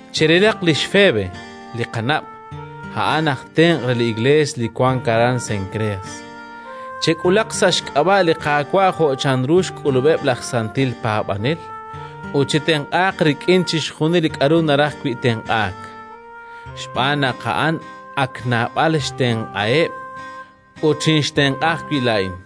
Cherilaq lix Febe li qanab'; a'an aj tenq' re li Iklees li wank aran Senkreas. Chek'ulaq sa' xk'ab'a' li Qaawa' jo' chanru xk'ulub'eb' laj santil paab'anel, ut chetenq'aaq rik'in chixjunil li k'aru naraj wi' tenq'aak, xb'aan naq a'an ak naab'al xtenq'aheb', ut xinxtenq'a ajwi' laa'in.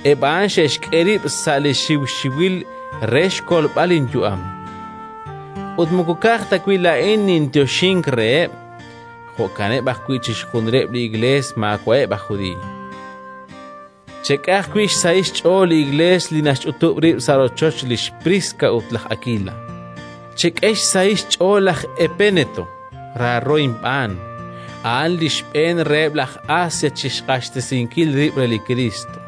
Eb' a'an xe'xk'e rib' sa' li xiwxiwil re xkolb'al linyu'am. Ut moko ka'aj ta wi' laa'in ninyoxink reheb', jo'kaneb' ajwi' chixjunileb' li Iklees maawa'eb' aj Judiiy. Chek'e ajwi' xsahil xch'ool li Iklees li naxch'utub' rib' sa' rochoch lix Priska ut laj Akila. Chek'e xsahil xch'ool laj Epéneto raaro inb'aan, a'an li xb'een reheb' laj Asia chi xq'axtesinkil rib' re li Kriist.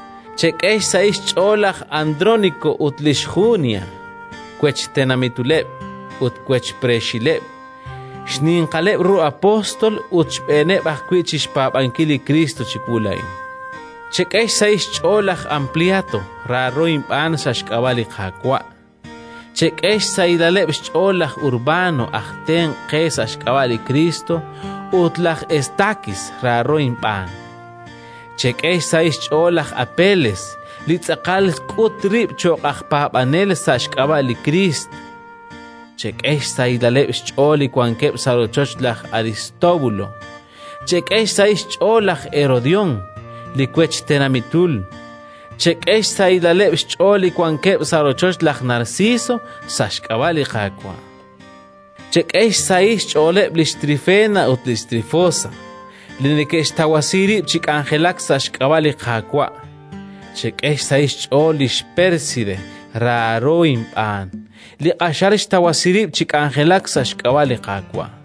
Chek'e xsahil xch'ool laj Andróniko ut lix Junia, wech tenamituleb' ut wech preexileb', xninqaleb' ru apóstol ut xb'eeneb' ajwi' chi xpaab'ankil li Kriist chiwu laa'in. Chek'e xsahil xch'ool laj Ampliato, raaro inb'aan sa' xk'ab'a' li Qaawa'. Chek'e xsahilaleb' xch'ool laj Urbano, aj tenq' qe sa' xk'ab'a' li Kriist, ut laj Estakis, raaro inb'aan. Chek'e xsahil xch'ool laj Apeles, li tz'aqal xk'ut rib' cho'q aj paab'anel sa' xk'ab'a' li Kriist. Chek'e xsahilaleb' xch'ool li wankeb' sa' rochoch laj Aristóbulo. Chek'e xsahil xch'ool laj Herodión, li wech tenamitul. Chek'e xsahilaleb' xch'ool li wankeb' sa' rochoch laj Narciso, sa' xk'ab'a' li Qaawa'. Chek'e xsahil xch'ooleb' lix Trifena ut lix Trifosa, li neke'xtawasi rib' chi k'anjelak sa' xk'ab'a' li Qaawa'. Chek'e xsahil xch'ool lix Pérside raaro inb'aan, li q'axal xtawasi rib' chi k'anjelak sa' xk'ab'a' li Qaawa'.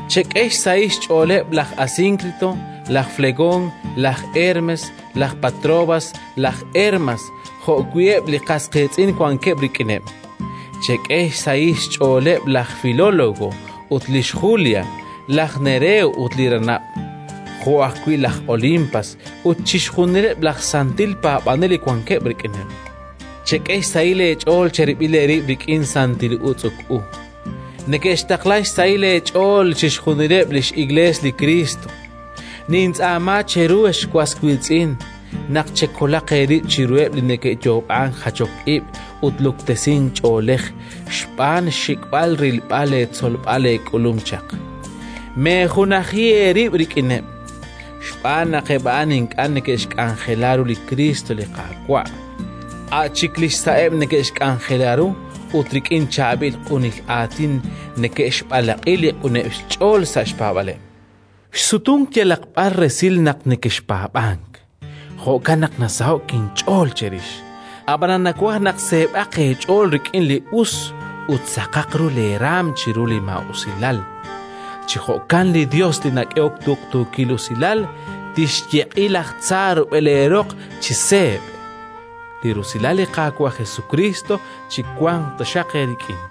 Chek'e xsahil xch'ooleb' laj Asínkrito, laj Flegón, laj Hermes, laj Patrobas, laj Hermas jo'wi' eb' li qas qiitz'in wankeb' rik'ineb'. Chek'e xsahil xch'ooleb' laj Filólogo ut lix Julia, laj Nereo ut li ranab', jo' ajwi' laj Olimpas ut chixjunileb' laj santil paab'anel li wankeb' rik'ineb'. Chek'e xsahil eech'ool cherib'il eerib' rik'in santil utz'uk u. Neke'xtaqla xsahil eech'ool chixjunileb' li x'Iklees li Kriist. Nintz'aama cheru, ex was wiitz'in, naq chekolaq eerib' chiruheb' li neke'yoob'ank jachok ib' ut luktesink ch'oolej xb'aan xxik'b'al rilb'al leetzolb'al eek'ulum chaq. Meejunaji eerib' rik'ineb', xb'aan naq eb' a'an ink'a' neke'xk'anjela ru li Kriist li Qaawa', a' chik li xsa'eb' neke'xk'anjela ru, ut rik'in chaab'il q'unil aatin neke'xb'alaq'i li q'uneb' xch'ool sa' xpaab'aaleb'. Xsutunk yalaq b'ar resil naq nekexpaab'ank; jo'kan naq nasaho'k inch'ool cherix. Ab'anan nawaj naq seeb'aq eech'ool rik'in li us ut saqaq ru leeraanm chiru li maa'usilal. Chi jo'kan li Yos li nak'ehok tuqtuukil usilal tixyeq'i laj tza rub'el eeroq chi seeb'. Li rusilal li Qaawa' Jesukriist chiwanq taxaq eerik'in.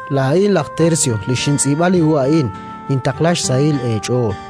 Laa'in laj Tersio li xintz'iib'a li hu a'in, nintaqla xsahil eech'ool.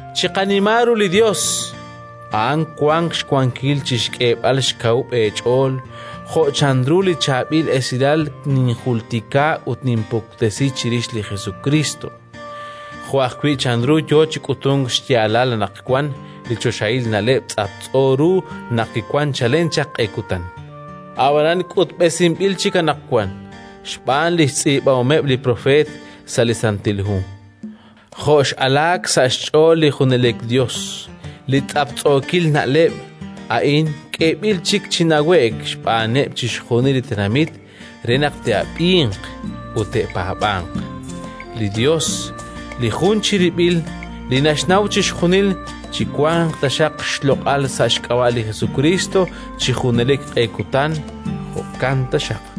Chiqanima ru li Yos! A'an wank xwankil chi xk'eeb'al xkawub' eech'ool, jo' chanru li Chaab'il Esilal ninjultika ut ninpuktesi chirix li Jesukriist, jo' ajwi' chanru yo chi k'utunk xyaalal anaqwan li choxahil na'leb' tz'aptz'o ru naq kiwank chalen chaq q'e kutan, ab'anan k'utb'esinb'il chik anaqwan xb'aan li xtz'iib'ahomeb' li propeet sa' li Santil Hu, jo' x'alaak sa' xch'ool li junelik Yos. Li tz'aptz'ookil na'leb' a'in k'eeb'il chik chi nawe'k xb'aaneb' chixjunil li tenamit re naq te'ab'inq ut te'paab'anq. Li Yos, li jun chirib'il li naxnaw chixjunil, chiwanq taxaq xloq'al sa' xk'ab'a' li Jesukriist chi junelik q'e kutan! Jo'kan taxaq.